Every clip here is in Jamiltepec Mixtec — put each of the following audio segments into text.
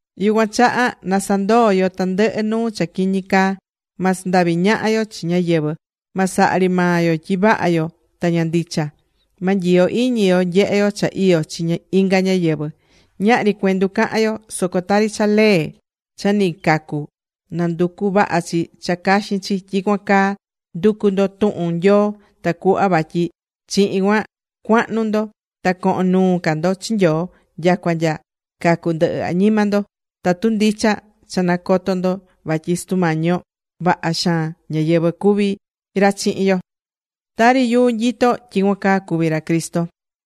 Yucuan chaha na sandoo yo tandɨhɨ nuu cha quiñi caa. Ma sandavi ñaha yo chi ñáyɨvɨ. Ma saha ri maa yo tyi vaha yo ta ña ndicha. Ma nyiyo iñi yo nyehe yo cha iyó chi inga ñáyɨvɨ. Ñahri cuendu cahan yo. Soco tari cha lee cha ni cacu̱, nanducú vavaha chi cha caxin chi, tyicuan caa ndu̱cu ndo tuhun Nyoo tacuhva vatyi chihin cuan cuahnu ndo ta cohon nuu ca ndo chi Nyoo, nyacua nya cacu ndɨhɨ añima ndo, tatu ndicha cha nacotó ndo vatyi Sutu Mañi yo, vaha xaan ñáyɨvɨ cuví ra chihin yo.Tari yuu nyitó, tyicuan caa cuví ra Cristo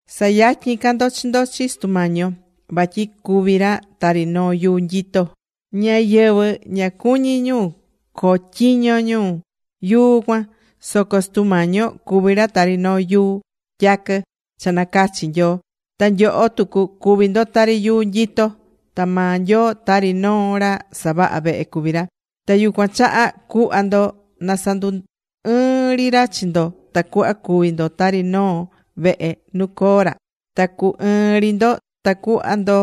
Sa̱yatyin ca ndo chi ndo chi Sutu Mañi yo. Vatyi cuví ra tari noo yuu nyitó. Ñáyɨvɨ ña cuñi̱ ñu cotyiño ñu yuu cuan. Soco Sutu Mañi yo cuví ra tari noo yuu tyaquɨ cha nacachi̱ Nyoo. Ta nyoho tucu cuví ndo tari yuu nyitó. Ta maa Nyoo tari noo ra savahá vehe cuví ra. Ta yucuan chaha cuhva ndo na sandu ɨɨn ri ra chi ndo tacuhva cuvi ndo tari noo vehe nu coo ra. Na cu ɨɨn ri ndo ta cu̱hva ndo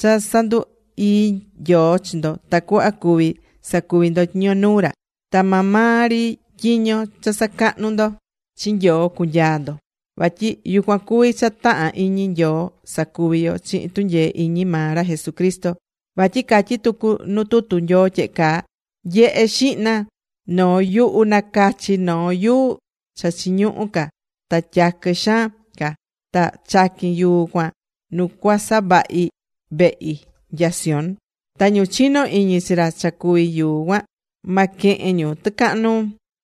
cha sandu ii Nyoo chi ndo tacuhva cuvi sacuvi ndo tyiño nuu ra. Ta maa maa ri tyiño cha sacahnú ndo chi Nyoo cucunyaa ndo. Vatyi yucuan cuví cha tahán iñi Nyoo sacuvi yo chihin tunyee iñi maa ra Jesucristo. Vatyi catyí tucu nuu tutu Nyoo tyehe caa: Nyehe xihna, yuhu nacachi̱ noo yuu cha chiñuhú ca ta tyaquɨ xaan ca, ta chaquín yuu cuan nu cuasavahi vehi nya Sión. Ta ñu chinó iñi chi ra cha cuví yuu cuan, ma quehen ñu tɨcahan nuu.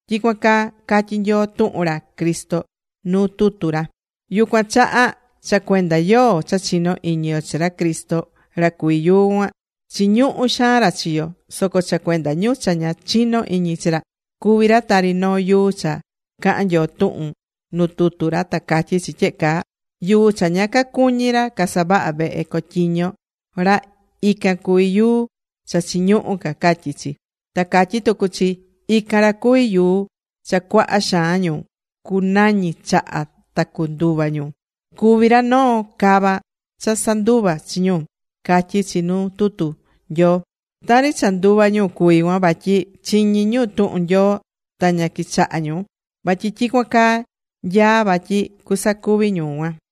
Tyicuan caa catyí Nyoo tuhun ra Cristo nuu tutu ra. Yucuan chaha, cha cuenda yoó cha chinó iñi yo chi ra Cristo ra cuví yuu cuan, chiñuhú xaan ra chi yo. Soco cha cuenda ñu cha ña chinó iñi chi ra, cuví ra tari noo yuu cha cahán Nyoo tuhun nu tutu ra ta catyí chi tyehe caa: Yuu cha ña cacuñi̱ ra casavahá vehe cotyiño ra, ican cuví yuu cha chiñuhú ca, catyí chi. Ta catyí tucu chi: Ican ra cuví yuu cha cuaha xaan ñu cunañi chaha ta nduva ñu. Cuví ra noo cava cha sanduvá chi ñu, catyí chi nuu tutu Nyoo. Tari cha nduvá ñu cuví cuan vatyi chiñí ñu tuhun Nyoo, ta ña quichahá ñu. Vatyi tyicuan caa nyaá vatyi cusacuvi ñu cuan.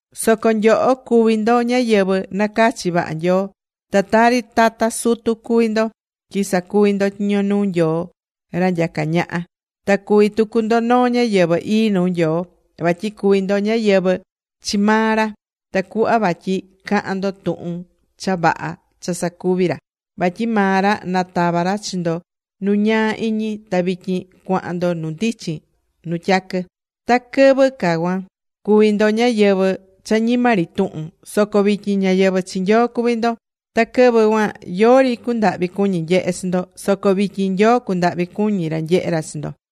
Soco nyoho cuví ndo ñáyɨvɨ nacachi̱ vaha Nyoo. Ta tari tata sutu cuví ndo tyi sacuví ndo tyiño nuu Nyoo, ra nyacá ñaha. Ta cuví tucu ndo noo ñáyɨvɨ ii nuu Nyoo. Vatyi cuví ndo ñáyɨvɨ chi maa ra, tacuhva vatyi cahan ndo tuhun cha vaha cha sacuví ra. Vatyi maa ra natava̱ ra chi ndo nu ñaa iñi ta vityin cuahan ndo nu ndichin nu tyaquɨ. Ta quɨvɨ ca cuan, cuvi̱ ndo ñáyɨvɨ cha ñima ri tuhun. Soco vityin ñáyɨvɨ chi Nyoo cuví ndo. Ta quɨvɨ cuan yori cundahvi cuñi̱ nyehe chi ndo, soco vityin Nyoo cundahvi cuñí ra nyehé ra chi ndo.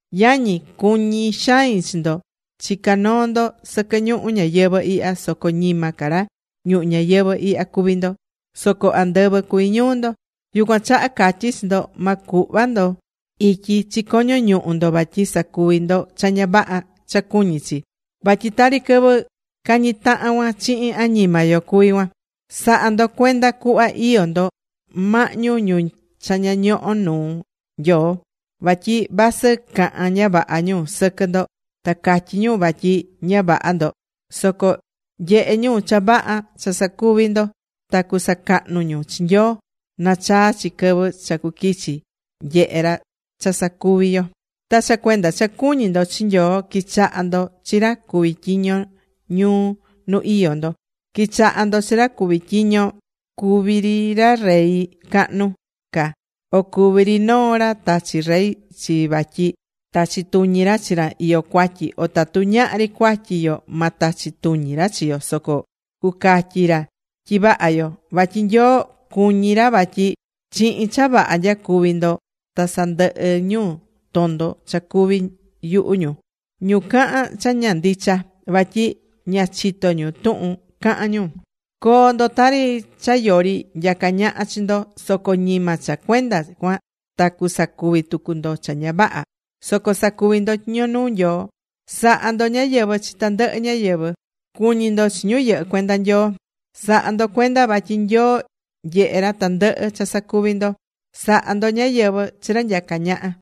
Yañi, cuñí xain chi ndo. Chicá noo ndo sɨquɨ ñuhu ñáyɨvɨ ihya, soco ñima ca ra ñuhu ñayɨvɨ ihya cuví ndo. Soco andɨvɨ cuví ñuu ndo. Yucuan chaha catyí chi ndo ma cuhva ndo ityi chi coño ñuhu ndo vatyi sacuvi ndo cha ña vaha cha cuñí chi. Vatyi tari quɨvɨ cañí tahan cuan chihin añima yo cuví cuan. Sa̱ha ndo cuenda cuhva iyó ndo mahñu ñu cha ña ñohó nuu Nyoo. Vatyi vasɨ cahán ña vaha ñu sɨquɨ ndo, ta catyí ñu vatyi ña vaha ndo, soco nyehé ñu cha vaha cha sacuví ndo ta cusacahnu ñu chi Nyoo nachaa chi quɨvɨ cha cuquichi nyehe ra cha sacuví yo. Ta cha cuenda cha cuñí ndo chi Nyoo, qui̱chaha ndo chi ra cuví tyiño ñuu nu iyó ndo. Qui̱chaha ndo chi ra cuví tyiño, cuví ri ra rey cahnu ca, o cuví ri noo ra tachi̱ rey chi vatyi tachi tuñi ra chi ra iyó cuatyi o tatu ñahri cuatyi yo ma tachi tuñi ra chi yo, soco cucatyi ra tyi vaha yo. Vatyi Nyoo cuñí ra vatyi chihin cha vaha nyacuví ndo ta sandɨhɨ ñu tondo cha cuví yuhu ñu, ñu cahán cha ña ndicha vatyi ña chitó ñu tuhun cahán ñu. Co̱o ndo tari cha yori nyacá ñaha chi ndo, soco ñima cha cuenda cuan ta cusacuvi tucu ndo cha ña vaha. Soco sa̱cuvi ndo tyiño nuu Nyoo. Sa̱ha ndo ñáyɨvɨ chi tandɨhɨ ñáyɨvɨ. Cu̱ñi ndo chi ñu yɨhɨ cuenda Nyoo. Sa̱ha ndo cuenda vatyi Nyoo nyehé ra tandɨhɨ cha sacuví ndo. Sa̱ha ndo ñáyɨvɨ chi ra nyacá ñaha.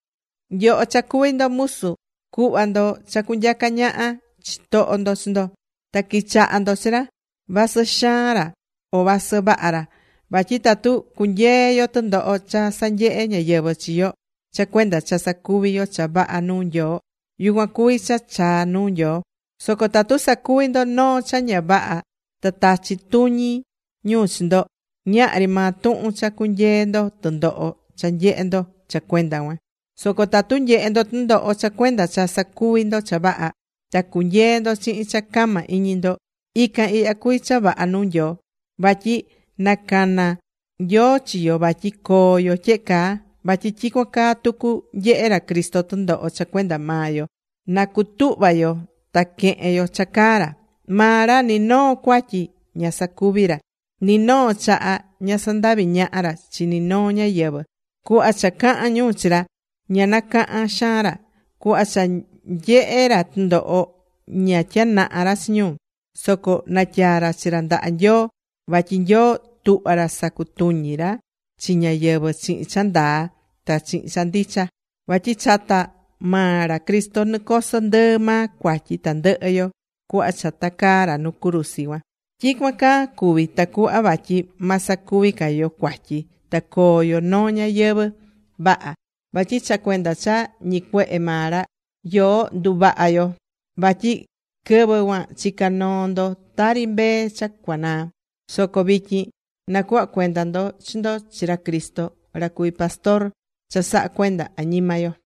Nyoho cha cuví ndo musu, cu̱hva ndo cha cunyaca ñaha chitoho ndo chi ndo, ta qui̱chaha ndo chi ra, vasɨ xaan ra o vasɨ vaha ra. Vatyi tatu cunyeé yo tɨndoho cha sanyehé ñáyɨvɨ chi yo cha cuenda cha sacuví yo cha vaha nuu Nyoo, yucuan cuví cha chaá nuu Nyoo. Soco tatu sacuví ndo noo cha ña vaha ta tachí tuñi ñu chi ndo, ñahri maa tuhun cha cunyeé ndo tɨndoho cha nyehé ndo cha cuenda cuan. Soco tatu nyehé ndo tɨndoho cha cuenda cha sacuví ndo cha vaha, ta cunyeé ndo chihin cha cama iñi ndo, ican ihya cuví cha vaha nuu Nyoo. Vatyi nacana̱ Nyoo chi yo vatyi coo yo tyehe caa. Vatyi tyicuan caa tucu nyehe̱ ra Cristo tɨndoho cha cuenda maa yo, na cutuhva yo ta quehen yo cha caá ra. Maa ra ni noo cuatyi ña sacuvi̱ ra. Ni noo chaha ña sandavi̱ ñaha ra chi ninoo ñáyɨvɨ. Cuhva cha cahán ñu chi ra, ña nacahán xaan ra. Cuhva cha nyehé ra tɨndoho, ña tyanahá ra chi ñu. Soco natyaa̱ ra chi ra ndaha Nyoo, vatyi Nyoo tuhvá ra sacutuñi ra chi ñayɨvɨ chihin cha ndaa ta chihin cha ndicha. Vatyi chata maa ra Cristo nicoso ndɨɨ maa cuatyi tandɨhɨ yo cuhva cha tacaá ra nu cruzi cuan. Tyicuan caa cuvi̱ tacuhva vatyi ma sacuvi ca yo cuatyi, ta coo yo noo ñayɨvɨ̱ vaha. Vatyi cha cuenda cha ñicuehe̱ maa ra, yoó nduvaha̱ yo. Vatyi quɨvɨ cuan chica̱ noo ndo tari mbee cha cuanaá. Soco vityin nacuhva̱ cuenda ndo chi ndo chi ra Cristo, ra cuví pastor cha sahá cuenda añima yo.